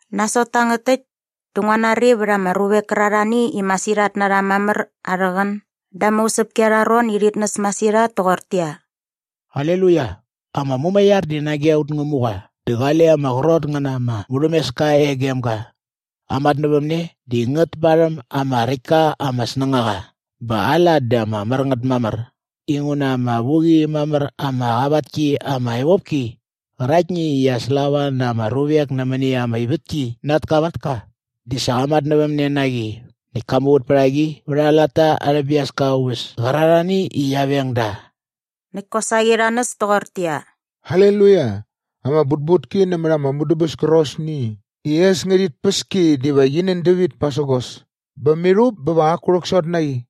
Nasot tangät täkt dä ngua nari vät ama ruvek kärarhani i masirhat na rha mamär arhä qän da ama usäpki arha ron i rhit näs masirhat toqortäqyia, “Aleluia! Ama mumaiar di nage aut Ngämuqa dä qale ama qrot ngä na ama murhämeska e gem ga Aa matnävämne di ngät parhäm ama räkt ka ama snängaqa bä aa lat di ama mär ngät mamär inguna ama vu qi mamär ama qavat ki ama evopki qäraktni i qia slava na ama ruvek nämäni ama ivätki na at kavatka di sa qa matnävämne na qi näkt ka muvät pät a qi vät aa latta arhä biaska aa uväs kärarhani i qia veng da.” Näkt kosaqi rha näs toqortäqyia, “Aleluia! Ama butbutki nämät ama mudäbäs kärqosni i äs ngärhit päs ki diva qi nän dävit pasägos bä mirhup bä va qaku rhäksot na qi.”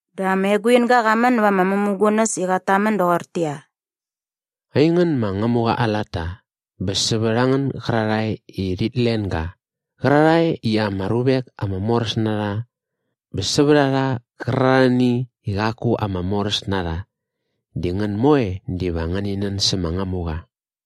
Dä ama eguinga qa män näva ama mämugunäs i qat tamän doqortäqyia, “Aingän ma Ngämuqa aa latta bä sävät a ngän gärarhae i rhit len ga qärarhae i ama ruvek ama moräs na rha bä sävät a rha qärarhani i qaku ama moräs na rha di ngän moe diva ngäni nän sä ma Ngämuqa.”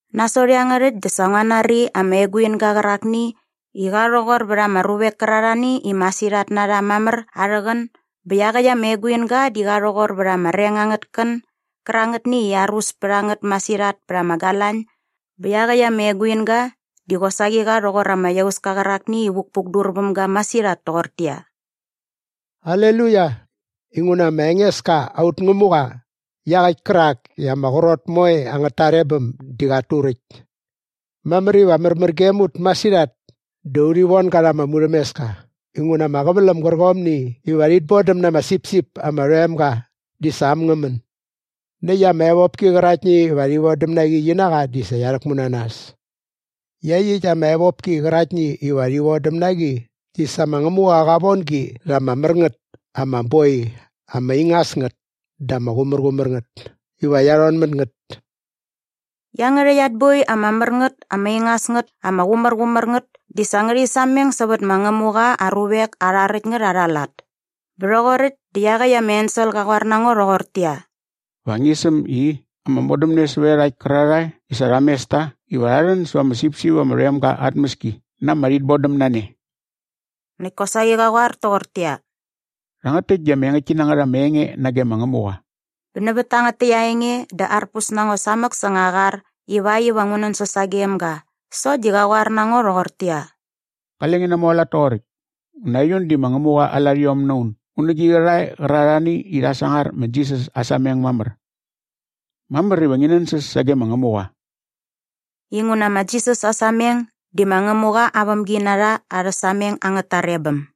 Nasot iangärhäkt dä sa ngua nari ama eguinga qärakni i qa rhoqor vät ama ruvek kärarhani i masirhat na rha mamär arhä qän bä iaqäkt ama eguinga di qa rhoqor vät ama reng angät kän gärangätni i arus pät a ngät masirhat pät ama galañ bä iaqäkt ama eguinga di qosaqi qa rhoqor ama iauska qärakni i vukpukdur väm ga masirhat toqortäqyia, “Aleluia! Inguna ma Engeska aut Ngämuqa iaqäkt kärak i ama qrot moe angät tarebäm di qat turäkt. Mamär iva märmär gem ut masirhat dä urhi von ga rha ama murhämeska inguna ama qäväläm gärqomni iva rhit bodäm na ama sipsip ama rhoem ga di sa äm ngä män. Näkt ama evopki qäraktni iva rhi vodäm na qi qi na qa di sa qia rhäkmu na nas. Iaqyäkt ama evopki qäraktni iva rhi vodäm na qi di sa ma Ngämuqa qa von gi rha ama mär ngät ama boi ama ingas ngät dä ama qumärqumär ngät iva qia rhon mät ngät.” Iangärhäkt at boi ama mär ngät ama ingas ngät ama qumärqumär ngät di sa ngärhi sameng sävät ma Ngämuqa aa ruvek arha räkt ngät arha lat. Bä rhoqoräkt dä iaqäkt ama ensel qa qoar na ngo rhoqortäqyia, “Va ngi säm i, ‘Ama modämne sävät iarhakt kärarhae i sa rha mes ta iva rha rhän säva ama sipsip ama rhoem ga aa tmäski na ama rhitbodämnane.’” Näkt kosaqi qa qoar toqortäqyia, “Rhangät täkt di ama engäktki na ngät ama enge nage ma Ngämuqa.” Bä nävät tangät täkt aa enge dä arpus na ngo samäk säng aa qar ivakt iva ngu nänsäs sagem ga sokt di qa qoar na ngo rhoqortäqyia, “Qale ngi namualat toqoräkt inguna aiun di ma Ngämuqa aa larhiom na un un nä gi qärhae qärarhani i rhat sangar ma Jisas aa sameng mamär. Mamär iva ngi nänsäs sage ma Ngämuqa.” Inguna ma Jisas aa sameng di ma Ngämuqa aa vämginarha arhä sameng angät tarebäm.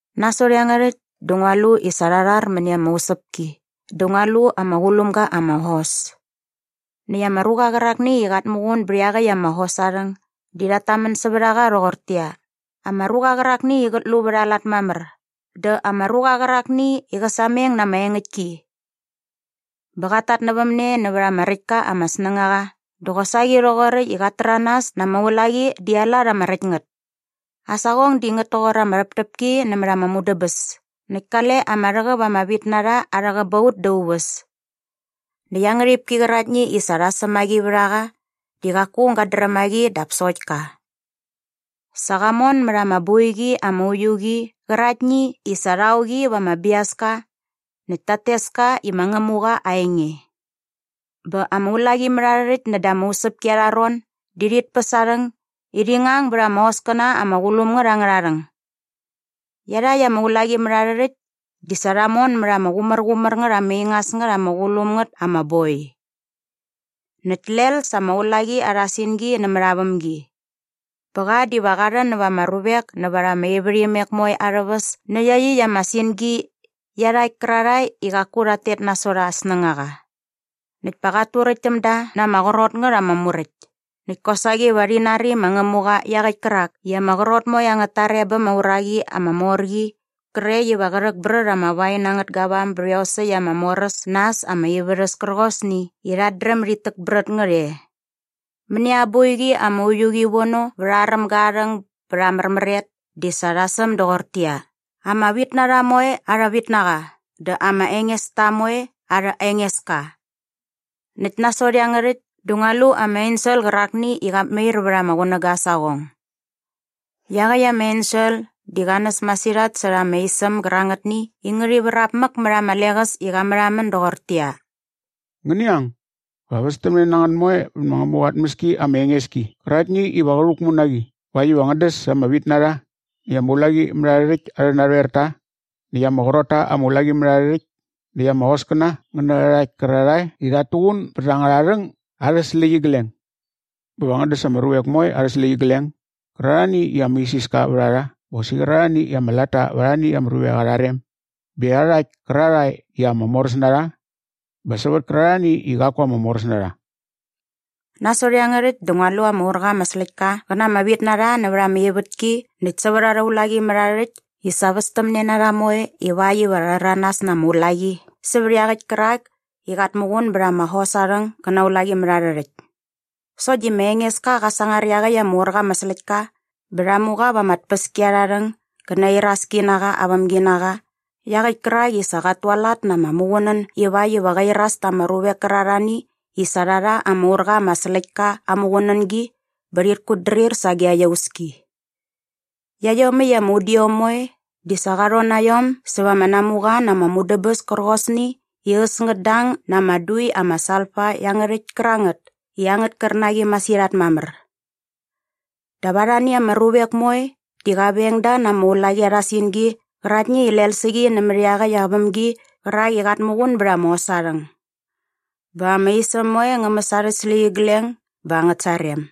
Nasot iangärhäkt dä ngua lu i sa rha rhar mäni ama usäpki dä ngua lu ama qulum ga ama hos. Näkt ama ruqa qärakni i qat muqun bät iaqäkt ama hos aa rhäng di rhat tamän sävät a qa rhoqortäqyia, “Ama ruqa qärakni i qät lu vät aa lat mamär.” dä “Ama ruqa qärakni i qä sameng na ama engäktki.” Bä qat tatnävämne nävät ama räkt ka ama snängaqa dä qosaqi rhoqoräkt i qat täranas na ama ulaqi di aa lat ama räkt ngät. Aa saqong di ngät toqor ama rhäptäpki nämät ama mudäbäs näkt kale ama rhäqäp ama vitnarha arhä qäbaut da aa uväs. Näkt aa ngärhipki qäraktni i sa rha säm a qi vät a qa di qaku aung gat dräm a qi dap sokt ka. Sa qa mon mät ama boiqi ama uiu qi qäraktni i sa rha o qi va ama biaska näkt tat tes ka i ma Ngämuqa Aa Enge. Bä ama ulaqimärharhärhäkt näda ama usäpki arha ron di rhit päs aa rhäng i rhi ngang bät ama hoskäna ama qulum ngät angärha rhäng. Iarhakt ama ulaqimärharhärhäkt di sa rha mon mät ama qumärqumär ngät ama ingas ngät ama qulum ngät ama boi. Näkt lel sa ama ulaqi arha singi nämät aa vämgi. Bä qa diva qa rhän näva ama ruvek nävät ama ivärhimek moe arhä väs nä iaqyäkt ama singi iarhakt kärarhae i qaku rhat tet nasot aa snängaqa. Näkt pa qat turäkt täm da na ama qrot ngät ama muräkt. Näkt kosaqi va rhi nari ma Ngämuqa iaqäkt kärak i ama qrot moe angät tarebäm aa uraqi ama mor qi qrekt iva qä rhäkbrät ama wain angät gavam bät iosäkt ama mor äs na äs ama ivärhäs kärqosni i rhat dräm dit täkbrät ngät e. Mäni aa boiqi ama uiu qi vono vät aa rämga aa rhäng bät aa märmäret di sa rha säm doqortäqyia, “ama vitnarha moe arha vitnaqa dä ama engesta moe arha Engeska.” Näkt nasot iangärhäkt dä ngua lu ama ensel qärakni i qat mair vät ama qunäga aa saqong. Iaqäkt ama ensel di qa näs masirhat särha ama isäm gärangätni i ngärhi vrap mäk mät ama leqäs i qa märhamän doqortäqyia, “Ngäni ang, va västämne na ngän moe vä ma Ngämuqa aa tmäski ama enges ki qäraktni iva qä rhäkmu na qi ivakt iva ngän däs ama vitnarha näkt ama ulaqimärharhärhäkt arhä narhoerta näkt ama qrot ta ama ulaqimärharhärhäkt näkt ama hoskäna ngä nä iarhakt kärarhae i rhat tuqun bät angärha rhäng arhä släqyigleng. Bä va ngän däs ama ruvek moe arhä släqyigleng gärarhani i ama isiska vät a rha bä qosaqi qärarhani i ama latta va arhani ama ruvek arha rem bä iarhakt kärarhae i ama moräs na rha bä sävät kärarhani i qaku ama moräs na rha.” Nasot iangärhäkt dä ngua lu ama ur qa ama släktka qä na ama vitnarha nävät ama ivätki näkt sävät arha ulaqimärharhärhäkt i sa västämne na rha moe ivakt iva rha rhäranas na ama ulaqi sävät iaqäkt kärak i qat muqun bät ama hos aa rhäng gä na aa ulaqimärharhärhäkt. Sokt di ma Engeska qa sangar iaqäkt ama ur qa ama släktka bä rha mu qa va ama tpäskiarharhäng gä na aa iraski na qa aa vämginaqa iaqäkt kärak i sa qat tualat na ama muqunän ivakt iva qä iras ta ama ruvek kärarhani i sa rha rha ama ur qa ama släktka aa muqunängi bä rhit kutdrir sage aa iauski. Iaiomäkt ama udiom moe di sa qa rhon na iom säva ama namuqa na ama mudäbäs kärqosni i äs ngät dang na ama dui ama salfa iangärhäkt kärangät i angät kärnaqi masirhat mamär. Dap arhani ama ruvek moe di qa veng da na ama ulaqi arha singi qäraktni i lel sä qi nämät iaqäkt aa vämgi qärak i qat muqun bät ama hos aa rhäng. Bä ama isäm moe ngä mäs arhä släqyigleng bä angät sarem.